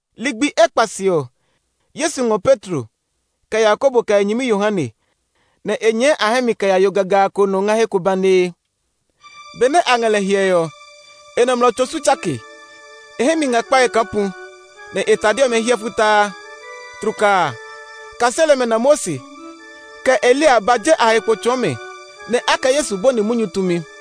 Ligbi ekpa se ɔ, Yesu ngɔ Petro, kɛ Yakobo kɛ e nyɛmi Yohane, nɛ e nyɛɛ a hɛ mi kɛ ya yo gagaa ko nɔ ngɛ he ko banee. Benɛ a ngɛ lɛ hyɛe ɔ, e nɔmlɔ tso su tsake; e hɛ mi ngɛ kpɛe kaa pu, nɛ e tade ɔmɛ hiɛ futaa. Tlukaa a, kaseli ɔmɛ na Mose, kɛ Eliya ba je a he kpo tsɔɔ mɛ, nɛ a kɛ Yesu bɔni munyu tumi.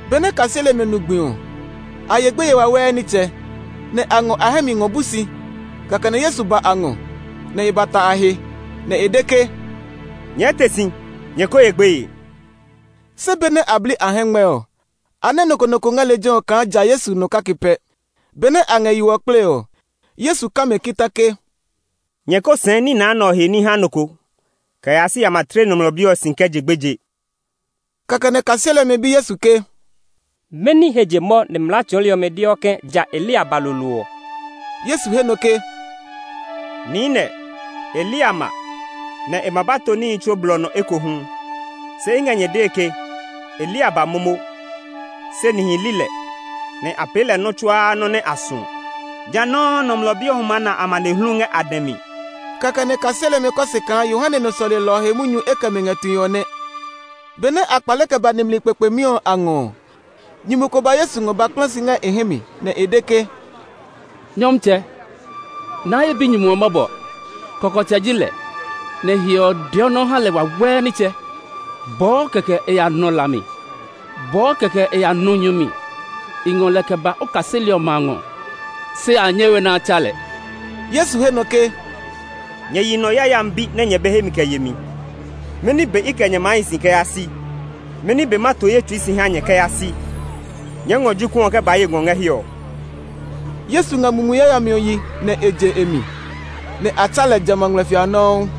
Benɛ kaseli ɔmɛ nu gbi ɔ, a ye gbeye wawɛɛ nitsɛ, nɛ a ngɔ a hɛ mi ngɔ bu si. Kɛkɛ nɛ Yesu ba a ngɔ, nɛ e ba ta a he, nɛ e de ke, “Nyɛɛ te si; nyɛ ko ye gbeye!” Se benɛ a bli a hɛngmɛ ɔ, a nɛ nɔ ko nɔ ko ngɛ lejɛ ɔ kaa ja Yesu nɔ kake pɛ. Benɛ a ngɛ yo ɔ kplee ɔ. Yesu ka mɛ kita ke, “Nyɛ ko sɛɛ nina nɛ ɔ he ní ha nɔ ko kɛ yaa si a ma tle Nɔmlɔ Bi ɔ si kɛ je gbeje.” Kɛkɛ nɛ kaseli ɔmɛ bi Yesu ke, “Mɛni he je mɔ nɛ mlaa tsɔɔli ɔmɛ deɔ ke ja Eliya ba lolo ɔ?” Yesu he nɔ ke, “Niinɛ, Eliya ma, nɛ e ma ba to níhi tsuo blɔ nɔ ekohu. Se i ngɛ nyɛ dee ke Eliya ba momo, se nihi li lɛ, nɛ a pee lɛ nɔ́ tsuaa nɔ́ nɛ a suɔ. Ja nɔuu Nɔmlɔ Bi ɔ hu maa na amanehlu ngɛ a dɛ mi.” Kɛkɛ nɛ kaseli ɔmɛ kɔ se kaa Yohane nɔ sɔlelɔ ɔ he munyu e kɛ mɛ ngɛ tue ɔ nɛ. Benɛ a kpale kɛ ba nimli kpekpemi ɔ a ngɔ ɔ, nyumu ko ba Yesu ngɔ ba kpla si ngɛ e hɛ mi, nɛ e de ke, “Nyɔmtsɛ, naa ye binyumu ɔ mɔbɔ! Kɔkɔtsɛ ji lɛ, nɛ hiɔ ɔ deɔ nɔ́ ha lɛ wawɛɛ nitsɛ. Bɔɔ kɛkɛ e ya nɔ la mi; bɔɔ kɛkɛ e ya nɔ nyu mi. I ngɔ lɛ kɛ ba o kaseli ɔmɛ a ngɔ, se a nyɛ we nɛ a tsa lɛ.” Yesu he nɔ ke, “Nyɛ yi nɔ yayami bi nɛ nyɛ be hemi kɛ yemi! Mɛni be i kɛ nyɛ maa hi si kɛ yaa si? Mɛni be ma to ye tsui si ha nyɛ kɛ yaa si? Nyɛɛ ngɔ jokuɛ ɔ kɛ ba ye ngɔ ngɛ hiɛ ɔ.” Yesu nga mumi yayami ɔ yi nɛ e je e mi, nɛ a tsa lɛ jamɛ a ngmlɛfia a nɔuu.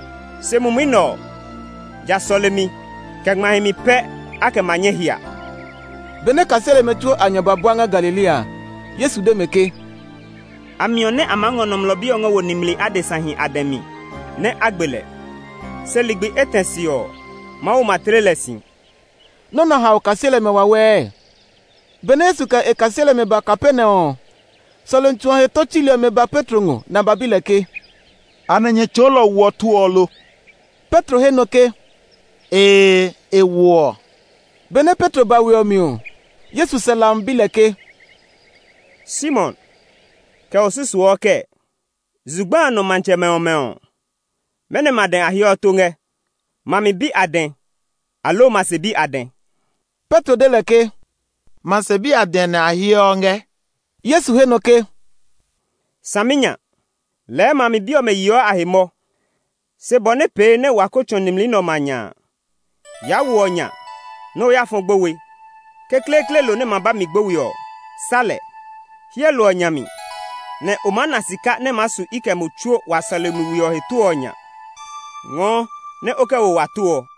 Se mumi nɛ ɔ, ja sɔlemi, kɛ ngma himi pɛ a kɛ ma nyɛ hia.] Benɛ kaseli ɔmɛ tsuo a nya ba bua ngɛ Galilea a, Yesu de mɛ ke, “A miɔ nɛ a maa ngɔ Nɔmlɔ Bi ɔ kɛ wo nimli adesahi a dɛ mi nɛ a gbe lɛ. Se ligbi etɛ se ɔ, Mawu ma tle lɛ si.” Nɔ́ nɛ ɔ hao kaseli ɔmɛ wawɛɛ. Benɛ Yesu kɛ e kaseli ɔmɛ ba Kapernaum ɔ, sɔlemi tsu ɔ he tó tsuli ɔmɛ ba Petro ngɔ, nɛ a ba bi lɛ ke, “Anɛ nyɛ tsɔɔlɔ ɔ woɔ tó ɔ lo?” Petro he nɔ ke, “Ee, e woɔ.” Benɛ Petro ba we ɔ mi ɔ, Yesu sɛ hlami bi lɛ ke, “Simon, kɛ o susuɔ kɛɛ? Zugba a nɔ matsɛmɛ ɔmɛ ɔ, mɛnɔmɛ a dɛ a heɔ tó ngɛ? Ma mi bi a dɛ, aloo ma se bi a dɛ?” Petro de lɛ ke, “Ma se bi a dɛ nɛ a heɔ ngɛ.” Yesu he nɔ ke, “Saminya! Lɛɛ ma mi bi ɔmɛ yeɔ a he mɔ! Se bɔ nɛ pee nɛ wa ko tsɔ̃ nimli nɛ ɔmɛ a nya a, yaa wo ɔ nya nɛ o ya fɔ gbowe. Kekleekle lo nɛ ma ba mi gbowe ɔ, sá lɛ. Hyɛ lo ɔ nya mi, nɛ o maa na sika nɛ maa su i kɛ mo tsuo wa sɔlemi we ɔ he tó ɔ nya. Ngɔɔ nɛ o kɛ wo wa tó ɔ.”